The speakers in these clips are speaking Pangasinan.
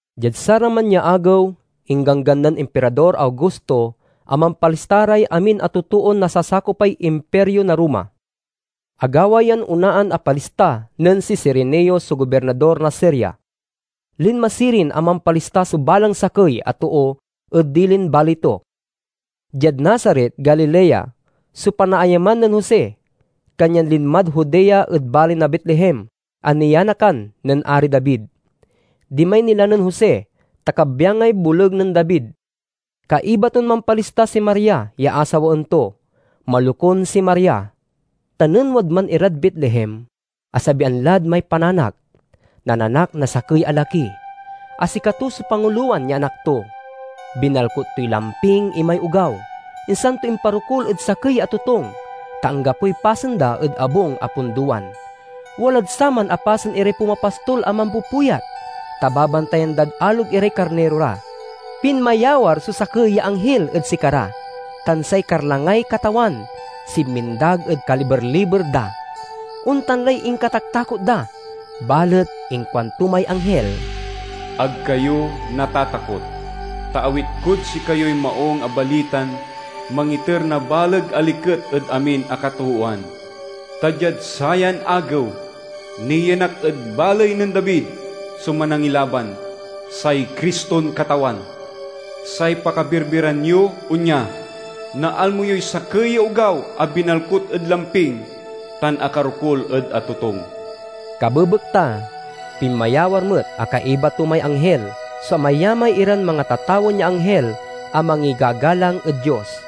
Diad saraman ya agew, ingganggan nen Impirador Augusto a mampalista ray amin a totoon nasasakopay Impirio na Roma. Agawa yan onaan a palista nen si Cirenio so gobirnador na Siria. Linma sirin a mampalista so balang sakey a too ed dilin baley to. Diad Nazaret, Galilea, so panaayaman nen Jose, kanyan linmad Judea ed baley na Betlehem a nianakan nen Ari David. Dimay nila nen Jose, ta kabyangay boleg nen David. Kaiba ton mampalista si Maria ya asawaen to. Malokun si Maria, tan nen wadman irad Betlehem, asabian lad may pananak. Nananak na sakey a laki, a sikato so pangulowan ya anak to. Binalkut toy lamping imay ogaw, insan to imparokul ed sakey ya atotung, ta anggapoy pasen da ed abung a pundowan. Walad saman a pasen iray pumapastol a mampupuyat, ta babantayan dad alog iray karniro ra. Pinmayawar so sakey ya anghil ed sikara, tan say karlangay Katawan sinmindag ed kaliber-liber da. Ontan lay inkataktakot da, balet inkuanto may anghil, "Ag kayo natatakot! Ta awit kod sikayoy maung a balitan mangiter na baleg a liket ed amin a katoowan. Ta diad sayan agew, nianak ed baley nen David so Manangilaban, say Criston Katawan! Say pakabirbiran yo onya: naalmo yoy sakey ya ogaw a binalkut ed lamping tan akarokul ed atotung." Kabebekta, pinmayawar met a kaiba to may anghil so amayamay iran mangatatawen ya anghil a mangigagalang ed Dios: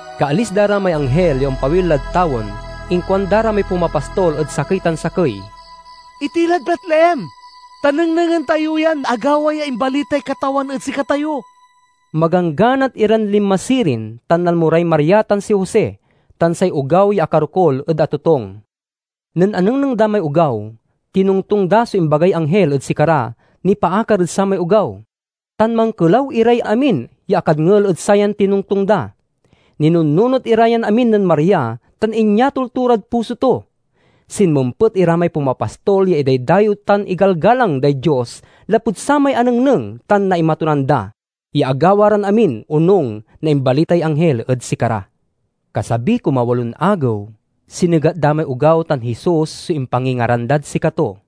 Kaalis da ra may anghil ya ompawil lad tawen, inkuanda ra may pumapastol ed sakey tan sakey, "Itilad Betlehem, ta nengnengen tayo yan agawa ya imbalitay Katawan ed sikatayo." Magangganat iran linma sirin, tan nalmo ray Maria tan si Jose, tan say ogaw ya akarokul ed atotung. Nen anengneng da may ogaw, tinongtong da so imbagay anghil ed sikara nipaakar ed samay ogaw, tan mankelaw iray amin ya akadngel ed sayan tinongtong da. Ninunnunot ira yan amin nen Maria tan inyatol to rad puso to. Sinmempet ira may pumapastol ya idaydayew tan igalgalang day Dios lapud samay anengneng tan naimatunan da, ya agawa ran amin onung na imbalitay anghil ed sikara. Kasabiy kumawalon agew, sinegat da may ogaw tan Jesus so impangingaran dad sikato.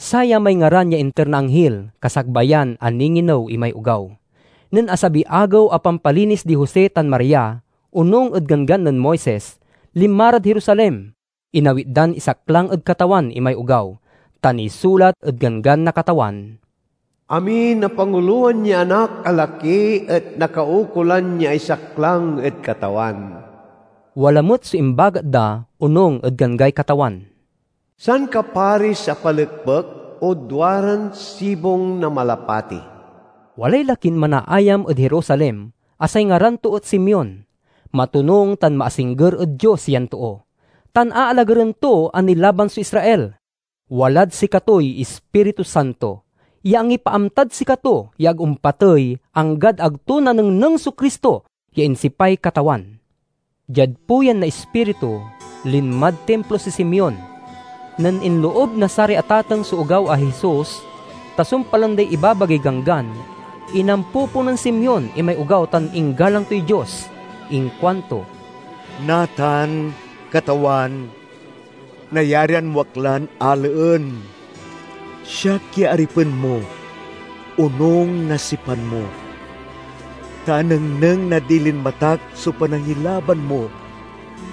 Saya may ngaran ya inter na anghil kasakbayan a ninginew imay ogaw. Nen asabiy agew a pampalinis di Jose tan Maria, onung ed Ganggan nen Moises, linma rad Jerusalem. Inawit dan isaklang ed Katawan imay ogaw. Ta nisulat ed ganggan na Katawan: "Amin a pangulowan ya anak a laki et nakaukolan ya isaklang ed Katawan." Wala met so imbagat da, onung ed ganggay Katawan: "Sankaparis a palekpek o duaran sibong na malapati." Walay lakin manaayam ed Jerusalem a say ngaran to et Simeon. Matonung tan maasingger ed Dios yan too, tan aalagaren to a nilaban so Israel. Walad sikatoy Ispiritu Santo ya angipaamtad sikato ya ag ompatey anggad ag to nanengneng so Cristo ya insipay Katawan. Diad puyan na Ispiritu, linmad Timplo si Simeon. Nen inloob na saray atateng so ogaw a Jesus ta sumpalen day ibabagay Ganggan, inampopo nen Simeon imay ogaw tan inggalang toy Dios. Inkuanto: "Natan, Katawan, nayarian mo ak lan alaen, siak ya aripen mo, onung na sipan mo. Ta anengneng na dilin matak so panangilaban mo,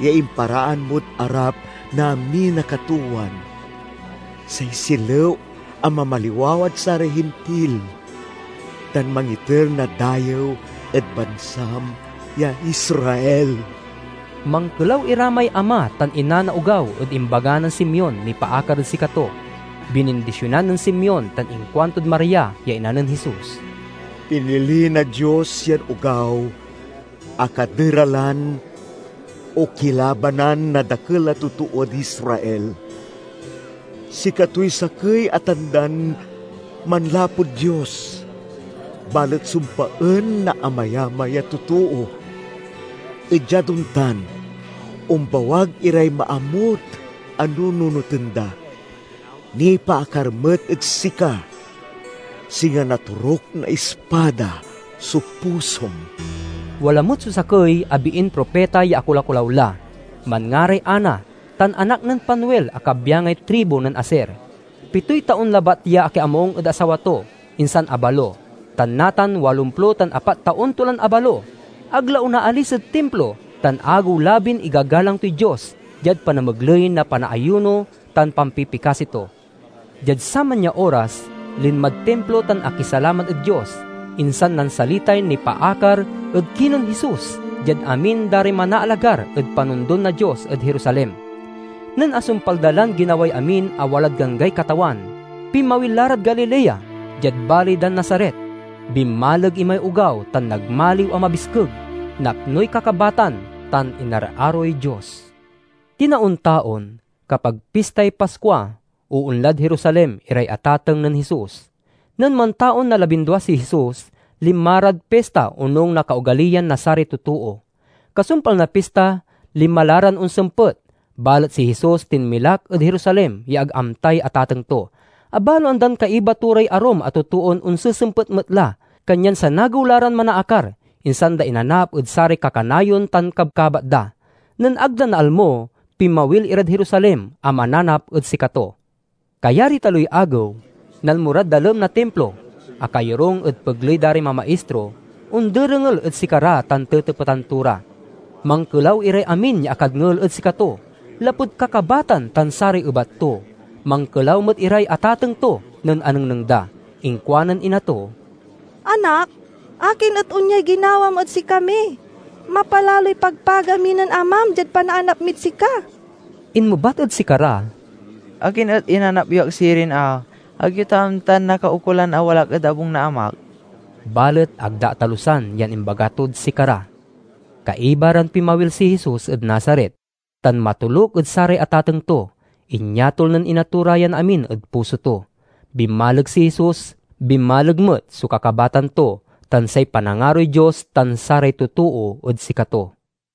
ya imparaan mod arap na amin a katoowan: Say silew a mamaliwawad saray Hintil, tan mangiter na dayew ed bansam ya Israel." Mankelaw ira may ama tan ina na ogaw ed imbaga nen Simeon nipaakar ed sikato. Binindisionan nen Simeon, tan inkuantod Maria ya ina nen Jesus, "Pinili na Dios yan ogaw a kaderalan o kilabanan na dakel a totood Israel. Sikatoy sakey a tandan manlapud Dios, balet sumpaen na amayamay a totoo, et diad ontan, ombawag iray maamut a nununoten da. Nipaakar met ed sika, singa natoruk na ispada so pusom." Wala met so sakey a biin propita ya akolakolaw la. Manngaray Anna tan anak nen Fanuel a kabyangay tribu nen Aser. Pitoy taon labat ya akiamung ed asawa to, insan abalo, tan natan walomplo tan apat taon to lan abalo. Ag la onaalis ed Timplo, tan agew-labin igagalang toy Dios diad panamegley na panaayuno tan pampipikasi to. Diad saman ya oras, linmad Timplo tan akisalamat ed Dios, insan nansalitay nipaakar ed kinen Jesus diad amin da ray manaalagar ed panondon na Dios ed Jerusalem. Nen asumpal da lan ginaway amin a walad ganggay Katawan, pinmawil la rad Galilea, diad baley dan Nazaret. Binmaleg imay ogaw tan nagmaliw a mabiskeg, napnoy kakabatan, tan inararoy Dios. Tinaon-taon, kapag Pistay Paskua, oonlad Jerusalem iray atateng nen Jesus. Nen mantaon na labindua si Jesus, linma rad pista onung na kaogaliyan na saray totoo. Kasumpal na pista, linma la ran onsempet. Balet si Jesus tinmilak ed Jerusalem ya ag amtay atateng to. Abaloan dan kaiba to ray arum a totoon onsesempet met la, kanyan sanagew la ran manaakar, insan da inanap ed saray kakanayon tan kabkabat da. Nen ag da naalmo, pinmawil irad Jerusalem a mananap ed sikato. Kayariy taloy agew, nalmo rad dalem na Timplo. Akayorung ed pegley da ray mamaistro, onderengel ed sikara tan tetepetan to ra. Mankelaw iray amin ya akadngel ed sikato, lapud kakabatan tan saray ebat to. Mankelaw met iray atateng to nen anengneng da. Inkuanen ina to, "Anak, akin et onyay ginawam ed sikami? Mapalaloy pagpaga mi nen amam diad panaanap mid sika." Inmebat ed sikara, "Akin et inanap yo ak sirin a? Ag yo ta amtan nakaukolan a wala ak ed abung na Amak?" Balet ag da atalusan yan imbaga tod sikara. Kaiba ran pinmawil si Jesus ed Nazaret, tan matoluk ed saray atateng to. Inyatol nen ina to ra yan amin ed puso to. Binmaleg si Jesus, binmaleg met so kakabatan to, tan say panangaroy Dios tan saray totoo ed sikato.